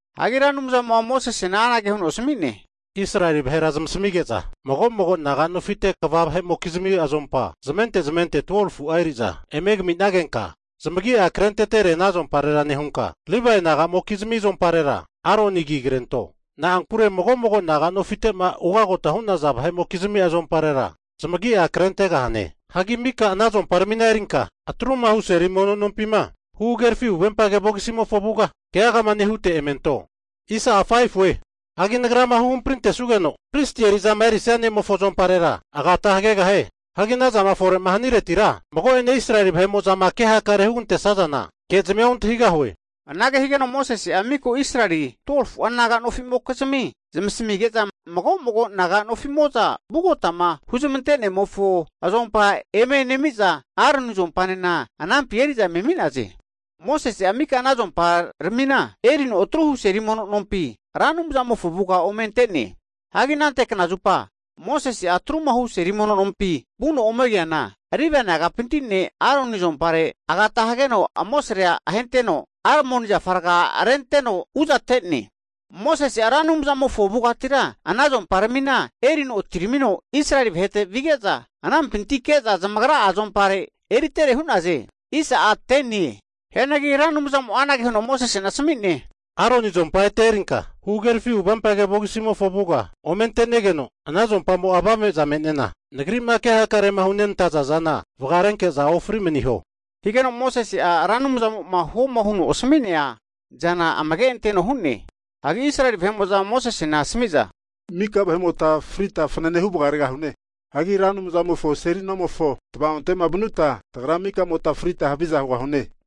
Hagi Ra Anumzamo'a Mosesena anage huno asami'ne, Israeli vahera zamasamige'za mago'mago naga nofimofonte kva vahe'mokizmi azompa zamente zamente 12fu'a eri'za eme kaminagenka, zamagi'a krentetere ana azomparera nehunka, Livae naga'mokizmi azomparera Aroni agi krento. Na'ankure mago'mago naga'nofitema ugota hu'naza vahe'mokizmi azomparera zamagia krentegahane. Hagi mika ana azomparamina erinka atrumahu seli mono nompima huhagerafi huvempage vogisimofo avuga keagama nehute eme anto. Hagi Nagrama huhamprintesugeno pristi eri'zama erisia ne'mofo azomparera agata hagegahie. Hagi ana zama fore'ma haniretira mago'ene Israeli vahe'mo'zama ke hakare'ma hugantesazana kezmia ontahigahue. Anage higeno Mosese'a miko Israeli vahera 2fu'a naga nofi'mokizmia zamasimige'za mago'mago naga nofimo'za vugotama huzmante'nemofo azompa eme nemiza, Aroni azompanena anampi eri'za eme ami'naze. Mosese'a mika ana azomparamina erino atruhu seli mono nompi Ra Anumzamofo avugama ome ante'ne. Hagi anante knazupa Mosese'a atruma hu seli mono nompima vuno ome keana, Livae nagapinti ne' Aroni azumparera agata hageno amosare'a ahenteno, almoni zafa raga rente'no uzate'ne. Mosese'a Ra Anumzamofo avugatira ana azomparamina erino atiramino Israeli vahete vige'za, anampinti ke'za zamagra'a azompare eritere hu'naze. Hianagi Ra Anumzamo'a Mosesena anage huno asmi'ne, Aroni azompa ete erinka huhagerafi huvempage vogisimofo avuga ome ante'negeno, ana azompamo'a avame'za me'nena Nagri'ma ke hakarema hunenantaza zana vagarenke'za, ofri maniho. Higeno Mosese'a Ra Anumzamo'ma huoma huno asmi'nea zana amage anteno hu'ne. Hagi Israeli vahe'mo'za Mosesena asami'za, mika vahe'mota frita fanane hu vagaregahune! Hagi Ra Anumzamofo seli nomofo tava'onte'ma vanuta, tagra mika vahe'mota frita haviza hugahune.